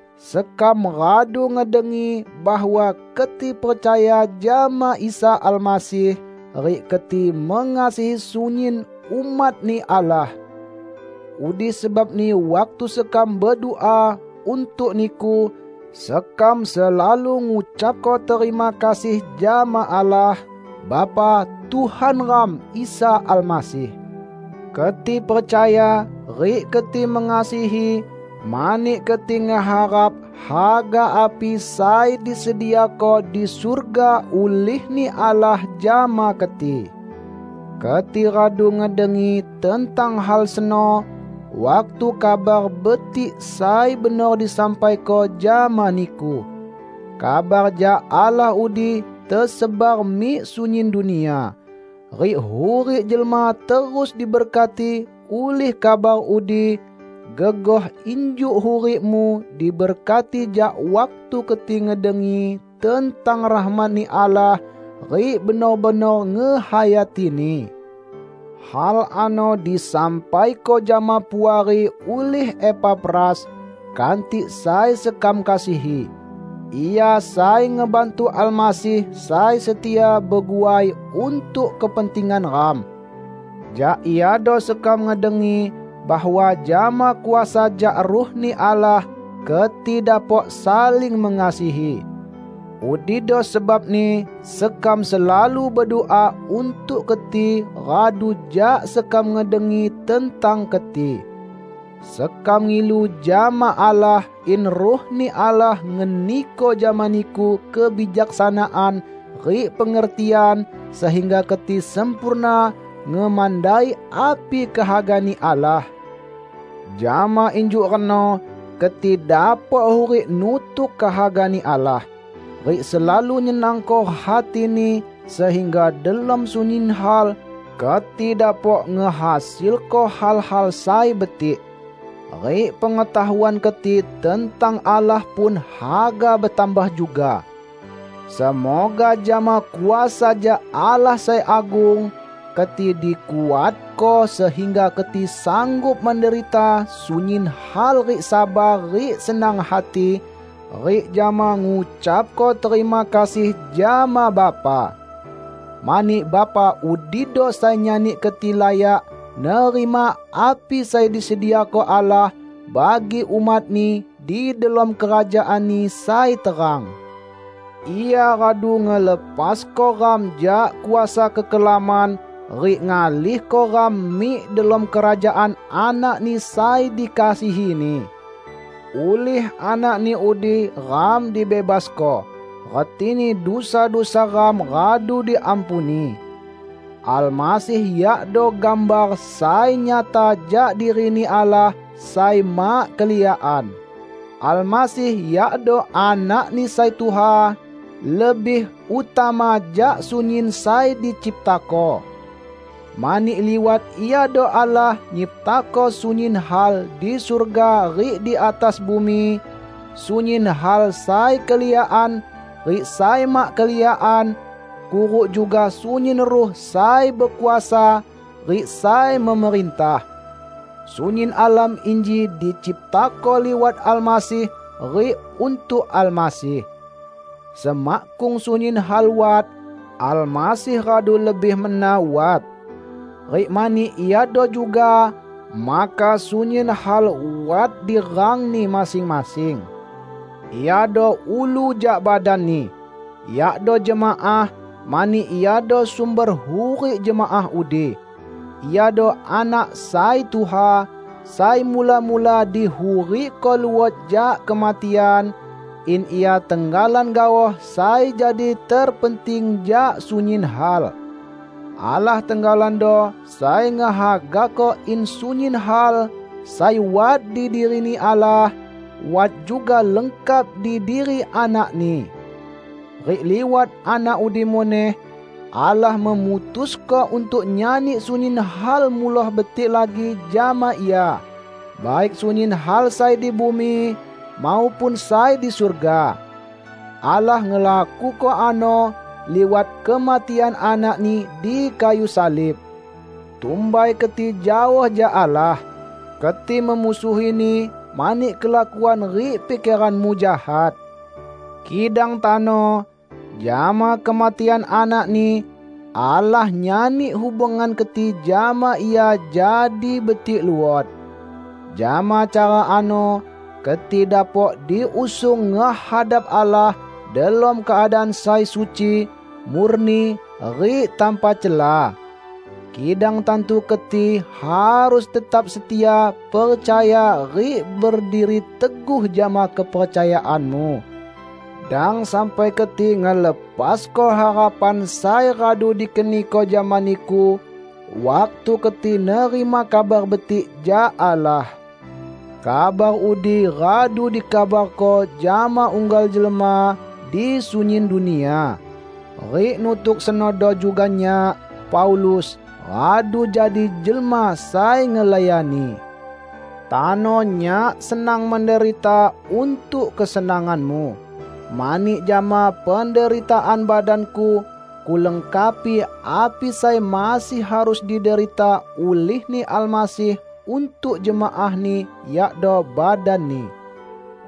Sekam radu ngedengi bahwa keti percaya jama Isa Almasih rik keti mengasihi sunyin umat-Ni Allah. Udi sebabni waktu sekam bedua untuk niku, sekam selalu ngucapko terima kasih jama Allah, Bapa Tuhan ram Isa Almasih. Keti percaya rik keti mengasihi, mani keti ngeharap haga api sai disediako di surga ulih-Ni Allah jama keti. Keti radu ngedengi tentang hal seno, waktu Kabar Betik sai benor disampaiko jama niku. Kabar jak Allah udi tesebar mik sunyin dunia, rik hurik jelma terus diberkati ulih kabar udi, gegoh injuk hurikmu diberkati jak waktu keti ngedengi tentang rahmat-Ni Allah rik benor-benor ngehayatini. Hal ano disampaiko jama Puari ulih Epafras, kantik sai sekam kasihi. Ia sai ngebantu Almasih sai setia beguai untuk kepentingan ram. Jak iado sekam ngedengi bahwa jama kuasa jak Ruh-Ni Allah keti dapok saling mengasihi. Udido sebabni sekam selalu bedua untuk keti radu jak sekam ngedengi tentang keti. Sekam ngilu jama Allah in Ruh-Ni Allah ngeniko jama niku kebijaksanaan rik pengertian sehingga keti sempurna ngemandai api kehaga-Ni Allah. Jama injuk reno keti dapok hurik nutuk kehaga-Ni Allah, rik selalu nyenangko hati-Ni, sehingga delom sunyin hal keti dapok ngehasilko hal-hal sai betik. Rik pengetahuan keti tentang Allah pun haga betambah juga. Semoga jama kuasa jak Allah sai agung, keti dikuatko sehingga keti sanggup menderita sunyin hal rik sabar rik senang hati, rik jama ngucapko terima kasih jama Bapa. Mani Bapa udido sai nyani keti layak nerima api sai disediako Allah bagi umat-Ni di delom kerajaan-Ni sai terang. Ia radu ngelepasko ram jak kuasa kekelaman rik ngalihko ram mik delom kerajaan Anak-Ni sai dikasihi-Ni. Ulih Anak-Ni udi ram dibebasko; retini dusa-dusa ram radu diampuni. Almasih yakdo gambar sai nyata jak diri-Ni Allah sai mak keliakan; Almasih yakdo anak sai tuha, lebih utama jak sunyin sai diciptako. Mani liwat Iado Allah nyiptako sunyin hal di surga rik di atas bumi, sunyin hal sai keliakan rik sai mak keliakan, kuruk juga sunyin ruh sai bekuasa rik sai memerintah. Sunyin alam inji diciptako liwat Almasih rik untuk Almasih. Semakkung sunyin hal wat, Almasih radu lebih mena wat. Rik mani Iado juga maka sunyin hal wat di rangni masing-masing. Iado ulu jak badan-Ni, yakdo jemaah, mani Iado sumber hurik jemaah udi. Iado Anak sai tuha, sai mula-mula dihurikko luot jak kematian, in Ia tenggalan gaoh sai jadi terpenting jak sunyin hal. Allah tenggalando sai ngehagako in sunyin hal sai wat di diri-Ni Allah, wat juga lengkap di diri Anak-Ni. Rik liwat Anak udi muneh Allah memutusko untuk nyani sunyin hal muloh betik lagi jama Ia -- baik sunyin hal sai di bumi, maupun sai di surga. Allah ngelakuko ano liwat kematian Anak-Ni di kayu salib. Tumbai keti jaoh jak Allah. Keti memusuhi-Ni mani kelakuan rik pikeranmu jahat. Kidang tano, jama kematian Anak-Ni, Allah nyani hubungan keti jama Ia jadi betik luot. Jama cara ano keti dapok diusung ngehadap Allah delom keadaan sai suci, murni rik tanpa cela. Kidang tantu keti harus tetap setia percaya rik berdiri teguh jama kepercayaanmu. Dang sampai keti ngelepasko harapan sai radu dikeniko jama niku waktu keti nerima Kabar Betik jak Allah. Kabar udi radu dikabarko jama unggal jelma di sunyin dunia. Rik nutuk senodo juga nyak; Paulus, radu jadi jelma sai ngelayani. Tano nyak senang menderita untuk kesenanganmu. Mani jama penderitaan badanku, kulengkapi api sai masih harus diderita ulih-Ni Almasih untuk jemaah-Ni, yakdo badan-Ni.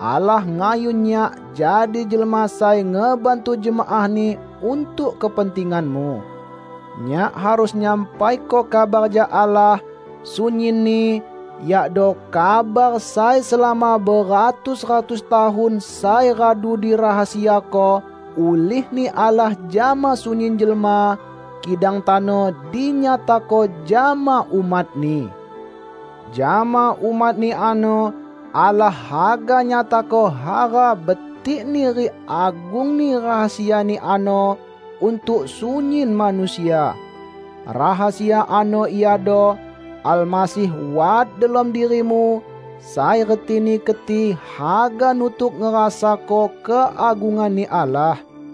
Allah ngayun nyak jadi jelma sai ngebantu jemaah-Ni untuk kepentinganmu. Nyak harus nyampaiko kabar jak Allah, sunyinni; yakdo kabar sai selama beratus-ratus tahun sai radu dirahasiako ulih-Ni Allah jama sunyin jelma, kidang tano dinyatako jama umat-Ni. Jama umat-Ni ano Allah haga nyatako hara betikni rik agungni rahasia-Ni ano untuk sunyin manusia. Rahasia ano iado: Almasih wat delom dirimu, sai retini keti haga nutuk ngerasako keagungan-Ni Allah.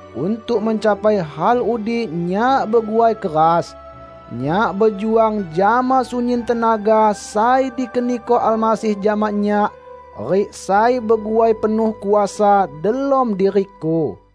Untuk mencapai hal udi nyak beguai keras. Nyak bejuang jama sunyin tenaga sai dikeniko Almasih jama nyak rik sai beguai penuh kuasa delom diriku.